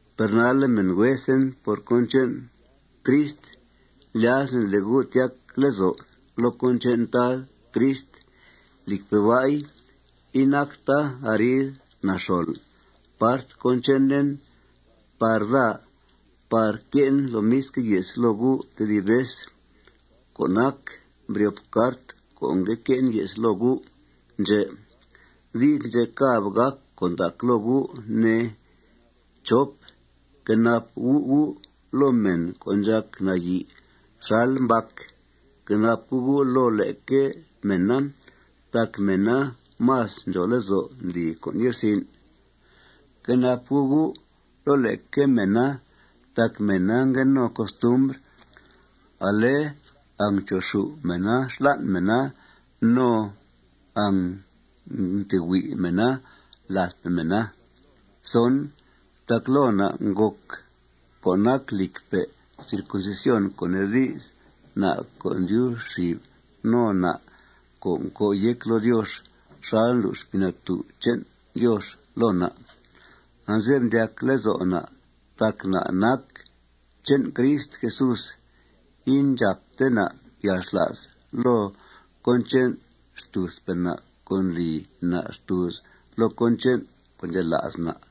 Per nalle', mèn huesen por cón che'n Crist, lyazen le' gu' tyac lezo' loo cón che'n Tad Crist. Lìcpe' ba'i, inacta arid naxol part cón chenen par daa par que'en lomisque' ye's loo gu' tedib vez co' nac mbryop cart co' ngue que'en ye's loo gu' ndxè'. Di's ndxè' càb gàc con' ndac loo gu', ne. Fquenap gu' gu' loo mèn co' ndxàc nayi' xal mbac. Fquenap gu' gu' loo leque mèna tac mèna más ndxòo lezo' ndli con' ye'rsin'. Fquenap gu' gu' loo leque mèna tac mèna ngue no costumbr ale angncho'xù' mèna xlan' mèna no angntehuí' mèna ladpe' mèna. Tac loo na' ngòc co' nac lìcpe' circuncisión, co' nee di's, na' co' ndyub xib no na' co' ncòo' yéc loo Diox xal ndlu' Xpii Natú' che'n Diox loo na'. Anze'f ndyac lezo' na' tac na' nac che'n Crist Jesús. Indxàpte na' yalxla's loo cón che'n xtùuzpe' na' co' ndli na' xtùuz loo cón che'n co' ndxela's na'.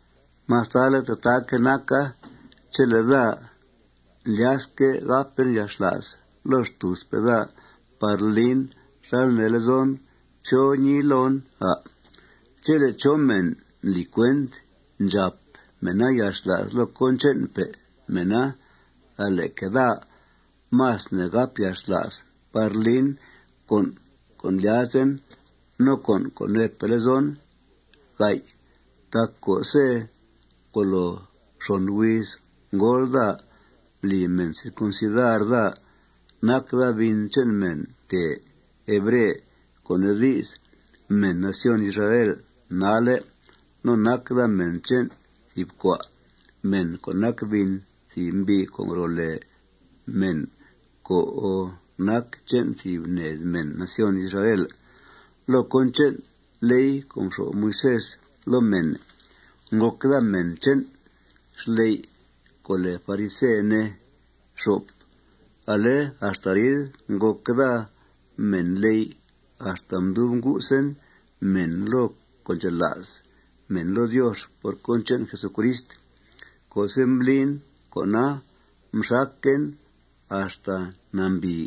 Mastale' tataaque' naca, chele' daa ndlyasque' ngàpen yalxla's loo xtùuzpe' daa par lin xal nee lezon, ¿chó ñiii loon, à'? Chele' chó mèn ndli cuent ndxàp mèna yalxla's loo cón che'npe' mèna, ale'que' daa más ne' gàp yalxla's par lin con' co' ndlyazen no con' co' neepe' lezon. Tac co'se' ngolo xon huiz ngóol daa, mbli mèn circuncidar daa. Nac daa bin che'n mèn tèe hebre, co' nee di's, mèn nación Israel nalle'. No nac daa mèn che'n thìb cua' mèn co' nac bin thìb mbi' co' ngro' lèe mèn co' nac che'n thìb ned mèn nación Israel. Loo cón che'n ley co' mxo'f Moisés loo mèn, ngòc daa mèn che'n xley' co' lèe farise, ne. Ale axta arid ngòc daa mènley' axta mdub ngusen mèn loo co' ndxela's mèn loo Diox por cón che'n Jesucrist. Co'se' mblin con'a, mxaquen axta nambìi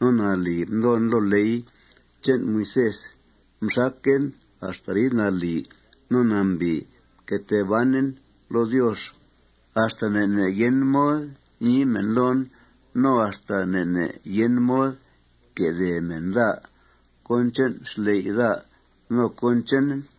no nalì mdoon loo ley che'n Moisés. Mxaquen axta arid nalì no nambìi mque tee banen loo Diox axta ne' ne' yen mod ñii mèn loon no axta ne' ne' yen mod quedèe mèn daa cón che'n xley' daa no cón chenen.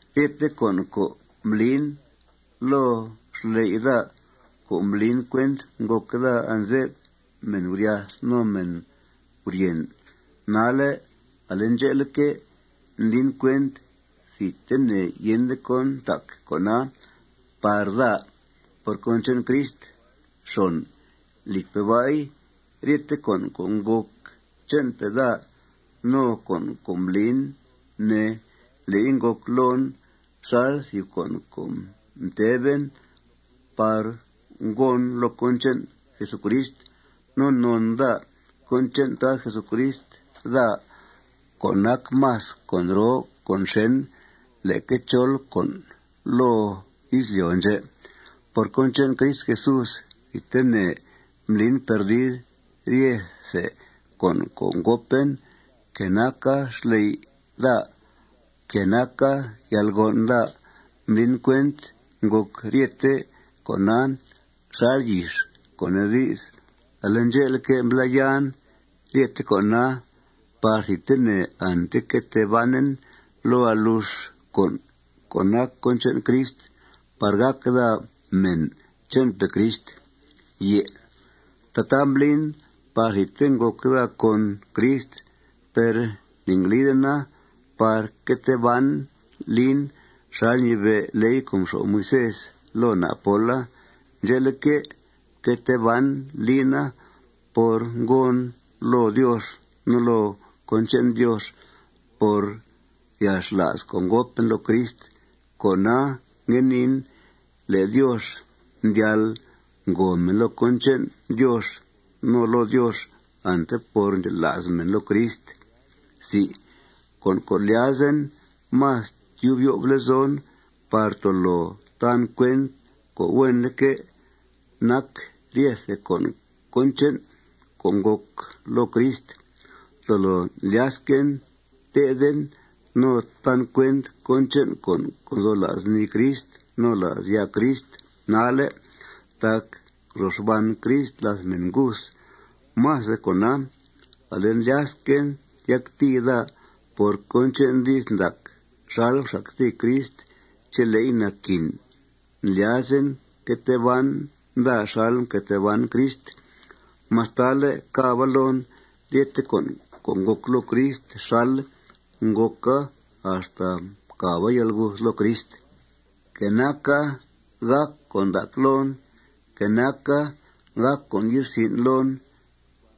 Ryete con' co' mblin loo xley' daa co' mblin cuent ngòc daa anze'f mèn guryath no mèn guryèn, nalle' ale ndxe'leque', ndlin cuent thidtene yende cón ntac con'a par daa por cón che'n Crist. Lìcpe' ba'i, ryete con' co' ngòc che'npe' daa no con' co' mblin, ne, le'i ngòc loon xal thìb con' co' mtè'ben par gòon loo cón che'n Jesucrist. No non daa cón che'n Tad Crist Jesús daa co' nac más con' roo con' xèn leque chol con' loo izlyo' ndxè'. Por cón che'n Crist Jesús, thidtene mblin perdid ryethe con' co' ngòpen, que naca xley' daa, que naca yalgon' daa. Mblin cuent ngòc ryete con'a xal yix, co' nee di's, ale ndxe'leque', mblá'yan ryete con'a par thidtene ante que tee banen loo alux con' co' nac cón che'n Crist par gàc daa mèn che'npe' Crist. Tataa mblin par thidte ngòc daa con Crist. Per ne'nglidena par que tee ban lin xal ñibe' ley co' mxo'f Moisés loo na' póla. Ndxe'leque', mque tee ban lina por ngòon loo Diox no loo cón che'n Diox por yalxla's co' ngòpen loo Crist. Cona, ngue niin le' Diox ndyal ngòo mèn loo cón che'n Diox no loo Diox ante por ndxela's mèn loo Crist. Con' co' ndlyazen más tyub yo'f lezon par tolo tan cuent co' huenleque' nac ryethe con' cón che'n co' ngòc loo Crist. Tolo lyasquen tethen no tan cuent cón che'n con' co' nzo la's nii Crist no la's ya' Crist nalle' tac ngro xban Crist làth mèn nguth. Más de cona, ale ndlyasquen tyactìi daa por cón che'n di's ndac xal mxactìi Crist chele'i naquin. Ndlyazen que tee ban daa xal mque tee ban Crist mastale' càba loon ryete con' co' ngòc loo Crist xal ngòca axta mcàba yalguth loo Crist. Que naca gàc con' ndac loon, que naca gàc con' ye'rsin' loon,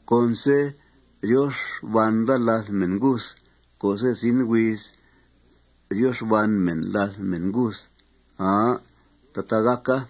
conse' ryo xban daa làth mèn nguth co'se' zin huiz ryo xban mèn làth mèn nguth. Aa. Tataa gàca.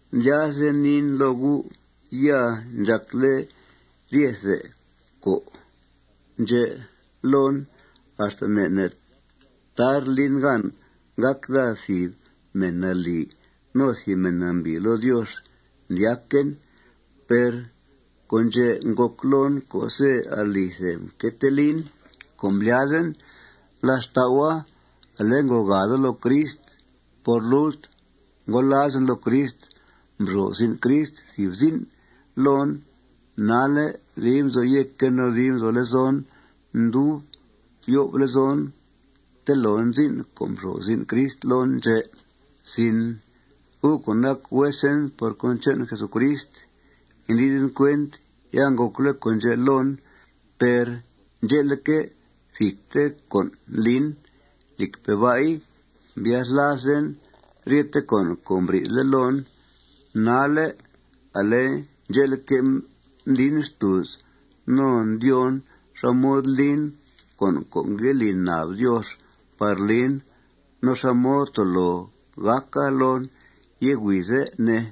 Indlyasten niin loo gu' ya ndxàcle' ryete con' ndxè' loon. Axta ne' ne' tar lin gan gàc daa thìb mèn nalì no thìb mèn nambìi loo Diox, ndyaquen. Per con' ndxè' ngòc loon co'se' alithe mque tee lin co' mblyazen. Làth xtau'a, ale ngogàa daa loo Crist. Por lult ngolazen loo Crist. Mxo'f zin' Crist thìb zin' loon. Nalle' dib nzo yéquen no dib nzo lezon ndub yo'f lezon telon zin' co' mxo'f zin' Crist loon ndxè'. Gu' co' nac huesen por cón che'n Jesucrist, indliden cuent ya ngòcle' con' ndxè' loon. Per ndxe'leque', thidte con' ndlin. Lìcpe' ba'i, mbyathlazen ryete con' co' mbri'thle' loon. Nalle', ale ndxe'leque', ndlin xtùuz no ndyóon xá mod lin con' co' ngue li nab Diox par lin no xá mod tolo gàca loon yé' huize', ne.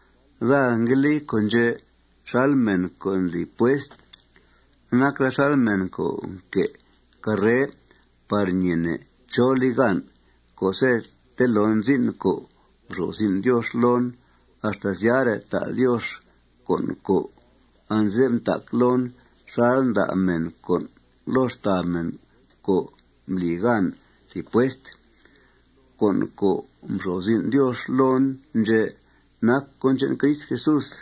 Daa ngue li con' ndxè' xal mèn co' ndli puest. Nac daa xal mèn co' nque' carre par ñeene' chó li gan. Co'se' telon zin' co' mxo'f zin' Diox loon, axta syare' ta' Diox con' co' anze'f ntac loon xal nda' mèn con' loo xtàa mèn co' mbli gan thìb puest. Con' co' mxo'f zin' Diox loon ndxè' nac cón che'n Crist Jesús.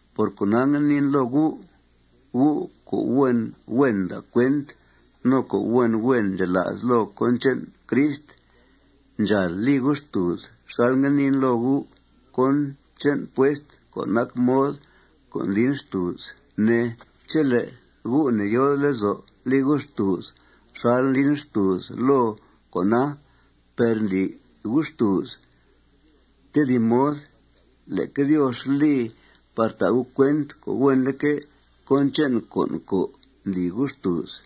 Por cona, ngue niin loo gu': Gu' co' huen huen nda' cuent no co' huen huen ndxela's loo cón che'n Crist, ndxàal li gu' xtùuz xal ngue niin loo gu' cón che'n puest co' nac mod co' ndlin xtùuz, ne. Chele' gu' ne'yòode lezo' li gu' xtùuz xal ndlin xtùuz loo con'a per ndli gu' xtùuz tedib mod, leque Diox li par ta' gu' cuent co' huenleque' cón che'n con' co' ndli gu' xtùuz.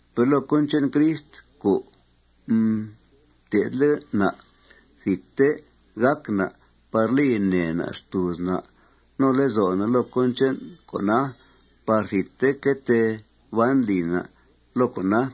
Per loo cón che'n Crist co' mté'thle' na', thidte gàc na' par li nèe na' xtùuz na' no lezo' na' loo cón che'n con'a par thidte que tee ban lì na' loo con'a.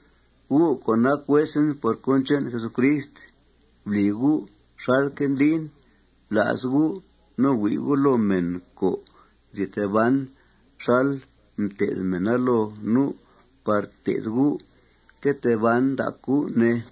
Gu' co' nac huesen por cón che'n Jesucrist, bli gu' xalque' ndlin. Bla's gu' no hui' gu' loo mèn co' nzi tee ban xal mté'th mèna loo nu' par té'th gu' que tee ban ndac gu', ne.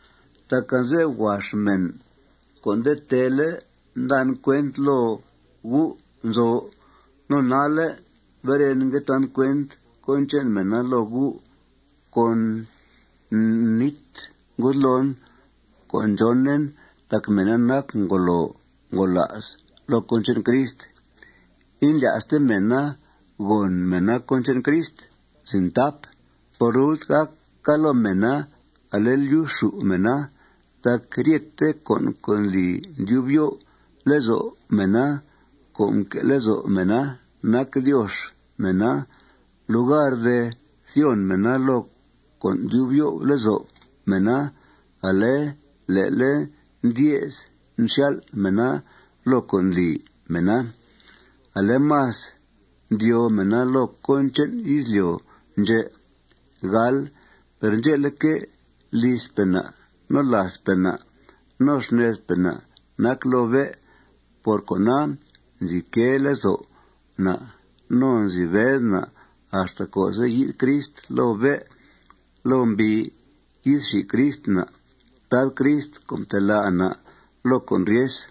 Tac anze'f huax mèn co' nde teele' ndan cuent loo gu' nzo. No nalle' beren, ngue tan cuent cón che'n mèna loo gu' con nít ngudloon co' ndxónen tac mèna nac ngolo ngola's loo cón che'n Crist. Indlya'ste mèna gòn mèna cón che'n Crist. Por lult, gàca loo mèna ale lyuxxù' mèna. Tac ryete con' co' ndli ndyub yo'f lezo' mèna co' nque' lezo' mèna nac diox mèna. Lugar de thyon mèna loo con' ndyub yo'f lezo' mèna, ale le'le' ndye's nxyal' mèna loo con' ndli mèna. Ale más ndyóo mèna loo cón che'n izlyo' ndxè'. Per ndxe'leque', lizpe' na', no làazpe' na', no xnedpe' na' nac loo bé'. Por cona, nzi quee lezo' na' no nzi bed na' axta co'se' yi'th Crist loo bé' loo mbii. Yi'th xi Crist na', Tad Crist co' mtelá' na' loo con' ryes.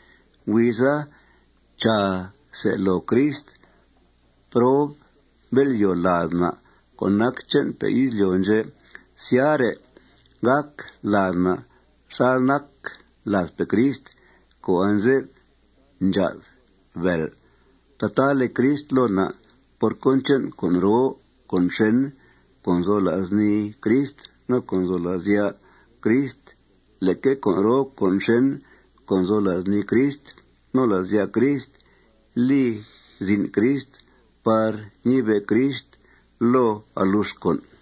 Huiza, chàa, se' loo Crist prob bél'yòo lad na' co' nac che'npe' izlyo' ndxè'. Syare', gàc lad na' xal nac ladpe' Crist co' anze'f ndxá'th bèel. Tataa li Crist loo na' por cón che'n con' roo con' xèn co' nzo la's nii Crist no co' nzo la's ya' Crist. Leque con' roo con' xèn co' nzo la's nii Crist no la's ya' Crist li zin' Crist par ñibe' Crist loo alux con'.